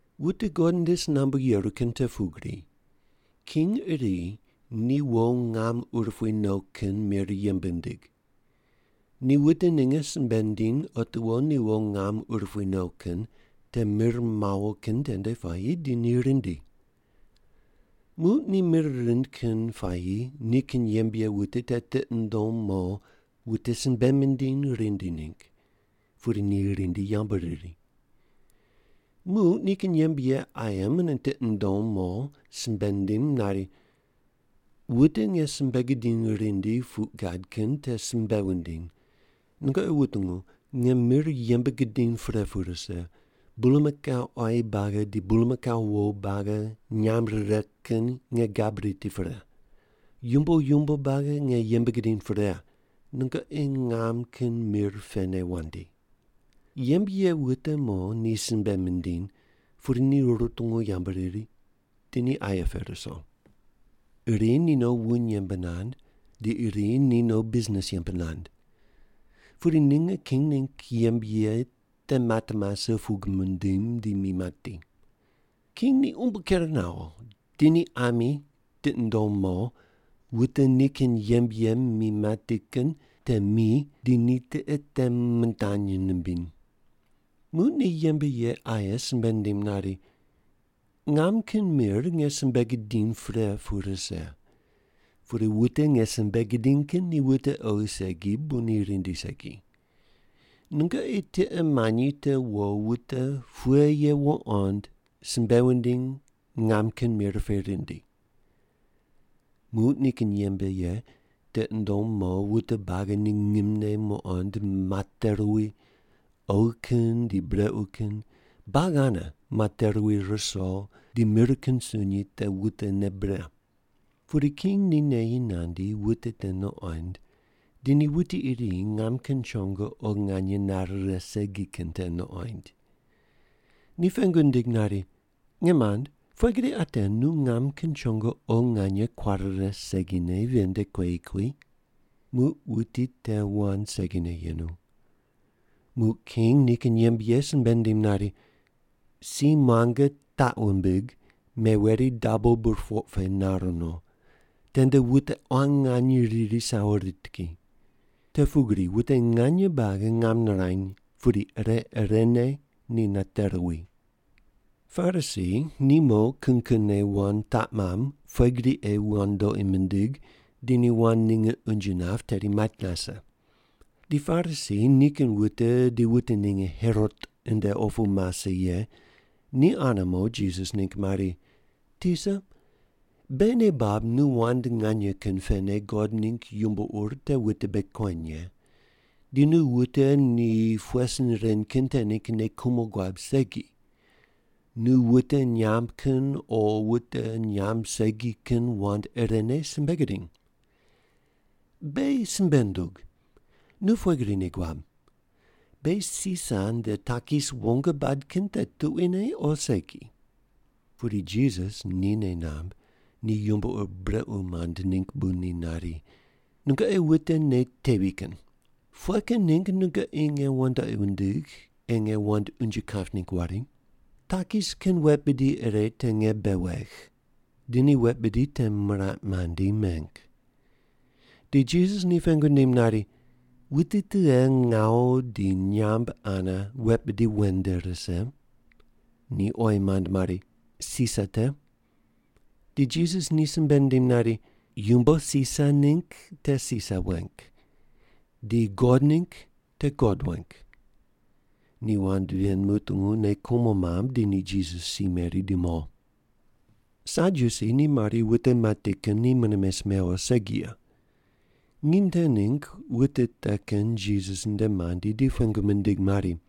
“Wute God nde si nambu yeru kin te pugri, king iri ni wo ngam urupui no kin mir yembe nindig. Ni wute ninge simbe nindiny otiwo ni wo ngam urupui no kin te mir mawo kin tende puayi di ni rindi. Muq ni mir rind kin puayi nikin yembe ye wute te tiqi nundom mo wute simbe mindiny rindi ningg, pudi ni rindi yambu riri. Muq nikin yembe ye aye mune tiqi nundom mo simbe nindim nari, ‘Wute nge simbe gidiny rindi puq gad kin te simbe wundiny, “Nungoqi wutungu, nge mir yembe gidiny pre pu rise, bulmakau quayi buagi di bulmakau wo buagi nyam rire kin nge gab riti pre. Yumbo yumbo buagi nge yembe gidiny pre, nungoqi ngam kin mir pene wandi”.’ “Yembe ye wute mo ni simbe mindiny, pudi ni rutungu yambu riri, di ni aye pe ruso. Iri ni no wuny yembe nand, di iri ni no bisnis yembe nand. Pudi ninge king ningg yembe ye te mat mase pug mindim di mi mati. King ni umbo ker nawo, di ni ami tiqi nundom mo, wute nikin yembe ye mi mati kin te mi di ni tiqe te mindany nimbiny. Muq ni yembe ye aye simbe nindim nari, ‘Ngam kin mir nge yembe gidiny pre pu rise, pudi wute nge simbe gidiny kin ni wute oghi segi bu ni rindi segi. Nungoqi tiqe manyi te wo wute pughe ye wuqond simbe wundiny ngam kin mir pe rindi.’ “Muq nikin yembe ye tiqi nundom mo wute buagi ni ngimne muqond mate ruwi, oghi kin di brequ kin, buagi ane mate ruwi riso, di mir kin sunyi te wutene bre. Pudi king ni neyi nandi wute te nuqond, di ni wuti iri ngam kin chongo oghi nganye nare righe segi kin te nuqoind. Ni pengu nindig nari, ‘Nge mand, pughe gri ate nu ngam kin chongo oghi nganye kuare righe segine ven nde kueyi kui?’ Muq wuti te wand segine yenu. Muq king nikin yembe ye simbe nindim nari, ‘Si muange taq wumbig, meweri dabo burpoq pe nar no. Tende wute quan nganye riri di sawo rit ki.’ Te pugri wute nganye buagi ngam nirany, pudi ire irene ni nate ruwi.” Parisi ni mo kin kinne wand taq mamb pughe gri ei wandoqi mindig di ni wand ninge unje nap tedi mait nase. Di Parisi nikin wute di wute ninge Herot nde opu mase ye te ane mo Jisas ningg mari, “Tisa, beghi nei bab nu wand nganye kin pene God ningg yumbo ur te wute bei kueny ye, di nu wute ni pughe sin ren kin te ningg nei kumo guab segi, nu wute nyamb kin o wute nyamb segi kin wand irene simbe gudiny. Beghi simbe ndug, nu pughe gri nei guab? Beghi Sisar nde takis wong bad kin te tuquine o segi?” Pudi Jisas ni nei namb ni yumbo ur brequ mand ningg bu ni nari, “Nungoqi wute nei tevi kin. Pughe kin ningg nungoqi nge wandoqi wundigh ei nge wand unje kap ningg wari? Takis kin wet bidi ire te nge bei wegh.” Di ni wet bidi te miraq mandi meng. Di Jisas ni pengu nindim nari, “Wuti tughe ngawu di nyamb ane wet bidi wen nde rise?” Ni oyi mand mari, “Sisar te.” Di Jisas ni simbe nindim nari, “Yumbo Sisar ningg te Sisar weng, di God ningg te God weng.” Ni wand ven mutungu, nei kumo mamb, di ni Jisas si meri di mo. Sadyusi ni mari wute mati kin ni mune mes mewo segi ye. Nginy te ningg wute te kin Jisas nde mandi di ni pengu mindig mari,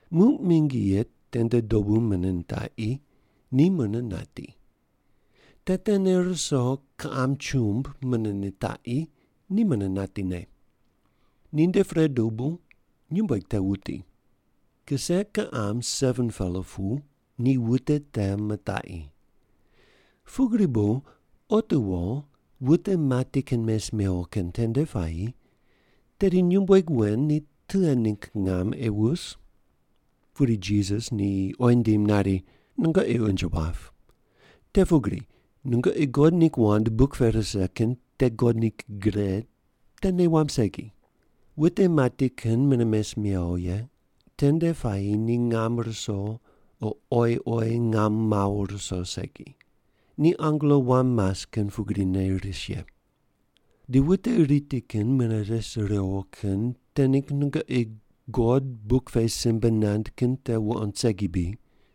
Muq mingi ye tende dobu mune nitaqi, ni mune nati. Te tene ruso kiqam chumb mune nitaqi, ni mune natine. Ninde pre dobu nyumbueg te wuti. Kise kiqam 7-pela pu ni wute te mitaqi. Pugri bu otiwo wute mati kin mes mewo kin tende puayi tedi nyumbueg wen ni tughe ningg ngam ei wus?” Pudi Jisas ni oyi nindim nari, “Nungoqi unje wap. Te pugri nungoqi God ningg wand buk pe rise kin di God ningg gre te nei wamb segi. Wute mati kin mune mes mewo ye tende puayi ni ngam ruso o oyi oyi ngam mawo ruso segi. Ni angelo wam mas kin pugrine ris ye. Di wute riti kin mune res riwo kin te ningg nungoqi God buk pe simbe nand kin te wuqond segi bri?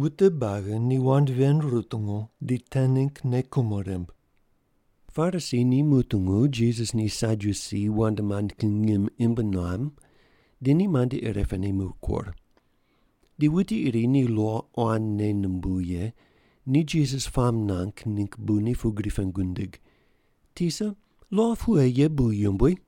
Wute buagi ni wand ven rutungu, di te ningg nei kumo rimb. Parisi ni mutungu Jisas ni Sadyusi wand mand kin ngim imb nuam, di ni mandi irepene mikur. Di wuti iri ni lo quan nei numbuw ye ni Jisas puamb nuang ningg bu ni pugri pengu nindig, “Tisa, lo pughe ye bu yumbui?”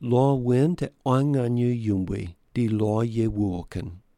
Lo wen te quan nganye yumbui di lo ye wuwo kin.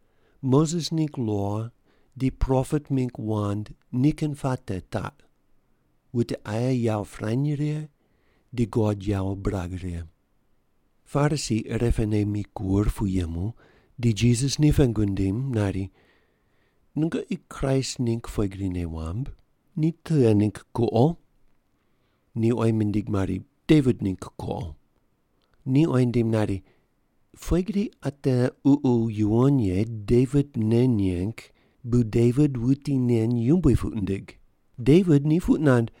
Moses ningg lo di propet mingg wand nikin puate taq, wute aye yawo pirany righe di God yawo birag righe.” Parisi irepene mikur pu yemu, di Jisas ni pengu nindim nari, “Nungoqi Kraist ningg pughe gri nei wamb? Ni tughe ningg kuqo?” Ni oyi mindig mari, “Devit ningg kuqo.” Ni oyi nindim nari, “Pughe gri ate Ququ Yuwon Ye Devit nei neng bu Devit wuti nen yumbui puq nindig? Devit ni puq nand,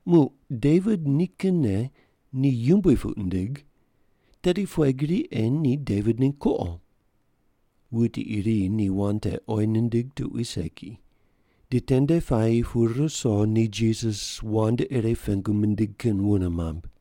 “Muq Devit nikinne ni yumbui puq nindig, tedi pughe gri ei ni Devit ningg kuqo?” Wuti iri ni wand te oyi nindig tuqui segi. Di tende puayi pu ruso ni Jisas wand ire pengu mindig kin wune mamb.